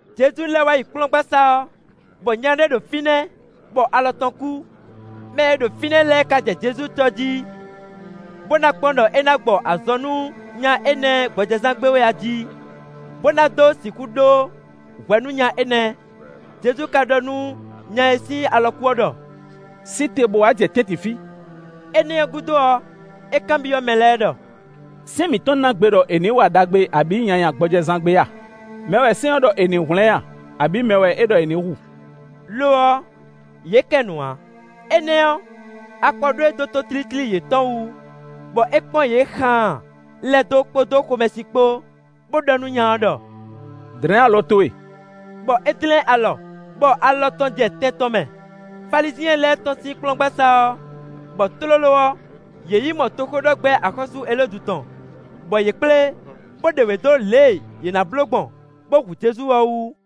Jezu lɛ́ wá yi kplɔ́ngbasá ɔ́, bɔ nya ɖé ɖo fínɛ́, bɔ alɔ tɔn kú. Mɛ e ɖo fínɛ́ lɛ́ɛ ká jɛ Jezu cɔ́ jí, bó ná kpɔ́n ɖɔ é ná gbɔ azɔn nú nya énɛ́ gbɔjɛzán gbe wɛ a jí, bó ná dó sixú ɖó hwɛ nú nya énɛ́. Jezu ka ɖɔ nú nya e sín alɔ kú ɔ́ ɖɔ: “Sí te bó wá jɛ tɛ́ntin fí.” Énɛ́ ɔ́ gúdo ɔ́, é kanbyɔ́ mɛ lɛ́ɛ ɖɔ: “Sɛ́n mǐtɔn ná gbe ɖɔ è nǐ wa ɖagbe abǐ nyanya gbɔjɛzán gbe a? Mɛ wɛ sɛ́n ɔ́ ɖɔ è nǐ hwlɛ́n a, abǐ mɛ wɛ é ɖɔ è nǐ hu?” Lo ɔ́, yě kɛ nu ǎ. Énɛ́ ɔ́, akpɔ ɖó e dó tótlítlí yětɔn wú, bɔ é kpɔ́n yě xaan lɛ́ dó kpódó xomɛsin kpó, bó ɖɔ nú nya ɔ́ ɖɔ: “Dlɛ̌n alɔ towe”, bɔ é dlɛ́n alɔ, bɔ alɔ tɔn jɛ tɛn tɔn mɛ. Falizyɛn lɛ́ɛ tɔ́n sín kplɔ́ngbasá ɔ́, bɔ tlóló ɔ́, yě yi mɔ toxóɖɔgbɛ́ axɔ́sú Elódu tɔn, bɔ yě kplé, bó ɖe wě dó lě e yě nǎ bló gbɔn, bó hu Jezu ɔ́ wú.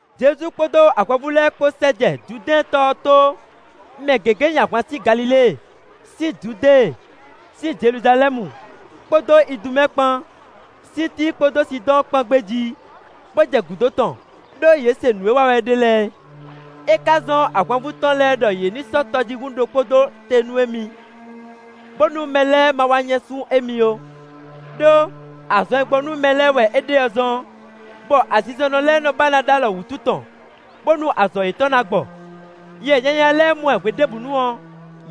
Jezu kpódó ahwanvú lɛ́ɛ kpó sɛ́ jɛ Judɛ́ɛn tɔ ɔ́ tó; mɛ gěgé nyi ahwan sín Galilée, sín Judée, sín Jeluzalɛ́mu, kpódó Idumɛ́ɛ kpan; sín Tíi kpódó Sidɔ́ɔn kpán gbé jí, bó jɛ gǔdo tɔn, ɖó yě se nǔ e wa wɛ é ɖe lɛ́ɛ. É ká zɔ́n ahwanvú tɔn lɛ́ɛ ɖɔ yě ní sɔ́ tɔjíhún ɖokpó ɖó te nú émí, bónú mɛ lɛ́ɛ ma wá nyɛ́sú émí ó. Đó, azɔn e gbɔ nú mɛ lɛ́ɛ wɛ é ɖe ɔ́ zɔ́n, bɔ azinzɔnnɔ lɛ́ɛ nɔ ba ná ɖó alɔ wǔtu tɔn, bónú azɔn yětɔn ná gbɔ. Yɛ nyanya lɛ́ɛ mɔ ɛ hweɖěbǔnu ɔ́,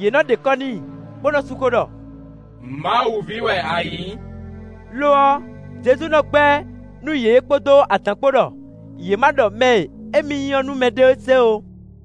yě nɔ́ ɖe kɔ́ n'i, bó nɔ́ sú xó ɖɔ: “Mawu ví wɛ a nyǐ!” Lo ɔ́, Jezu nɔ gbɛ́ nú yě kpódó adǎn kpó ɖɔ yě ma ɖɔ mɛ e émí nyí ɔ́ nú mɛɖé se ó.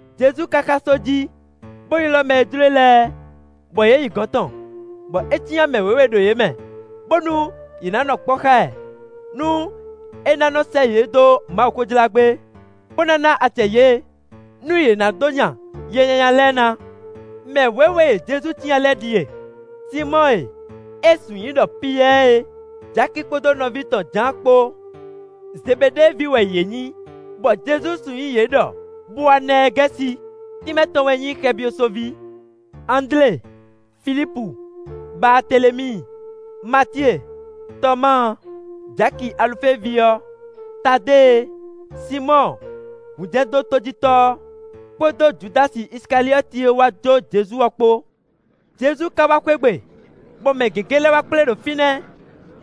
Jezu ka xá só jí, bó ylɔ́ mɛ e jló e lɛ́ɛ, bɔ yě yi gɔ̌n tɔn; bɔ é cyán mɛ wěwe ɖo yě mɛ bónú yě ná nɔ kpɔ́ xá ɛ, nú é ná nɔ sɛ́ yě dó Mawuxó jlá gbé, bó ná ná acɛ yě, nú yě ná dó nya yɛ nyanya lɛ́ɛ ná. Mɛ wěwe e Jezu cyán lɛ́ɛ ɖíe: Sinmɔ́ɔ e é sun nyǐ ɖɔ Piyɛ́ɛ é, Jaki kpódó nɔví tɔn Jǎan kpó, Zebeɖée ví wɛ yě nyǐ, bɔ (Jezu sun nyǐ yě ɖɔ Boanɛɛgɛ́si, tínmɛ tɔn wɛ nyí “xɛbyosoví.”) Andlé, Filípu, Baatelemíi, Matíe, Tɔmáa, Jaki Alufée ví ɔ́, Tadée, Sinmɔ́ɔ hunjɛdótojítɔ́ ɔ́, kpódó Judási Isikaliɔ́ti e wá jó Jezu ɔ́ kpó. Jezu ka wá xwé gbe, bɔ mɛ gěgé lɛ́ wá kplé ɖo fínɛ́,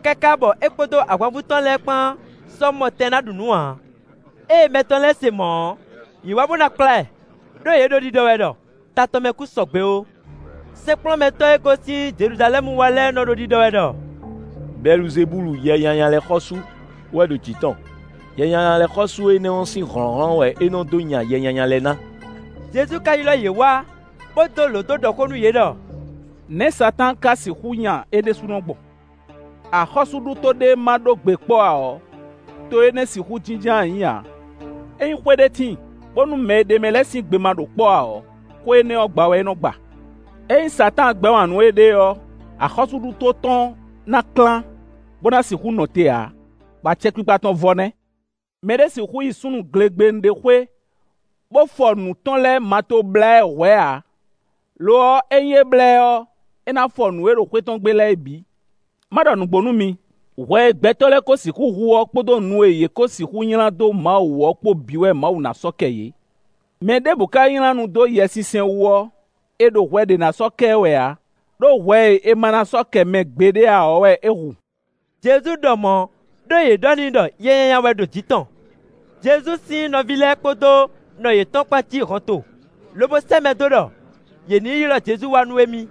káká bɔ é kpódó ahwanvú tɔn lɛ́ɛ kpán sɔ́ mɔ tɛn ná ɖu nǔ ǎ. Ée mɛ tɔn lɛ́ɛ se mɔ̌ ɔ́, yě wá bó ná kplá ɛ, ɖó yě ɖo ɖiɖɔ wɛ ɖɔ ta tɔn mɛ kún sɔ́ sɔgbe ó. Sɛ́nkplɔ́nmɛtɔ́ e gosín Jeluzalɛ́mu wá lɛ́ɛ nɔ́ ɖo ɖiɖɔ wɛ ɖɔ: “Bɛluzebúlu (yɛ nyanya lɛ́ɛ xɔ́sú) wɛ ɖo jǐ tɔn; yɛ nyanya lɛ́ɛ xɔ́sú énɛ́ ɔ́ sín hlɔ̌nhlɔ́n wɛ é nɔ́ dó nya yɛ nyanya lɛ́ɛ ná.” Jezu ka ylɔ́ yě wá, bó dó lǒ dó ɖɔ xó nú yě ɖɔ: “Nɛ̌ Satáan ka sixú nya é ɖésúnɔ gbɔn? Axɔ́súɖuto ɖé ma ɖó gbe kpɔ́ ǎ ɔ́, to énɛ́ ɔ́ sixú jínjɔ́n ayǐ ǎ. Ényí xwé ɖé tíin, bónú mɛ e ɖ'é mɛ lɛ́ɛ sín gbe ma ɖo kpɔ́ ǎ ɔ́, xwé énɛ́ ɔ́, gba wɛ é nɔ gba. Ényí Satáan gbɛ́ wǎn nú éɖée ɔ́, axɔ́súɖuto tɔn ná klán, bó ná sixú nɔ te ǎ, bɔ acɛkpikpa tɔn vɔ nɛ́. “Mɛ ɖé sixú yi súnnu glegbenu ɖé xwé, bó fɔ nǔ tɔn lɛ́ɛ ma tó blá ɛ hwɛ̌ ǎ; lo ɔ́, ényí é blá ɛ ɔ́, é ná fɔ nǔ e ɖo xwé tɔn gbe lɛ́ɛ é bǐ. “Ma ɖɔ nǔgbó nú mi: hwɛ e gbɛtɔ́ lɛ́ɛ kó sixú hu ɔ́ kpódó nu e yě kó sixú nylá dó Mawu wú ɔ́ kpó bǐ wɛ Mawu ná sɔ́ kɛ yě. Mɛ ɖěbǔ ka nylá nu dó Yɛsinsɛn wú ɔ́, è ɖo hwɛ ɖé ná sɔ́ kɛ ɛ wɛ ǎ; ɖó hwɛ e è ma ná sɔ́ kɛ mɛ gbeɖé ǎ ɔ́ wɛ é hu.” Jezu ɖɔ mɔ̌ ɖó yě ɖɔ n'i ɖɔ yɛ nyanya wɛ ɖo jǐ tɔn. Jezu sín nɔví lɛ́ɛ kpódó nɔ yětɔn kpán cí hɔnto, lobo sɛ́ mɛ dó ɖɔ yě ní yi ylɔ́ Jezu wá nú émí.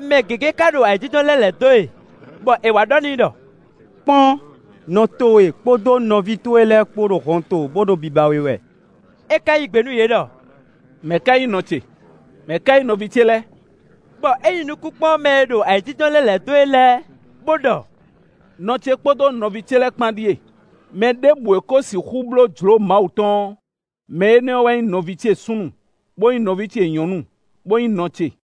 Mɛ gěgé ka ɖo ayǐjínjɔ́n lɛ́ lɛ̌ dó e, bɔ è wá ɖɔ n'i ɖɔ: “Kpɔ́n! Nɔ towe kpódó nɔví towe lɛ́ɛ kpó ɖo hɔnto, bó ɖo biba we wɛ.” É ka yí gbe nú yě ɖɔ: “Mɛ̌ ká nyí nɔ ce? Mɛ̌ ká nyí nɔví ce lɛ́ɛ?” Bɔ é nyi nukún kpɔ́n mɛ e ɖo ayǐjínjɔ́n lɛ́ lɛ̌ dó e lɛ́ɛ, bó ɖɔ: “Nɔ ce kpódó nɔví ce lɛ́ɛ kpán ɖíe. Mɛ ɖěbǔ e ko sixú bló jlǒ Mawu tɔn ɔ́, mɛ énɛ́ ɔ́ wɛ nyí nɔví ce súnnu, bó nyí nɔví ce nyɔ̌nu, bó nyí nɔ ce.”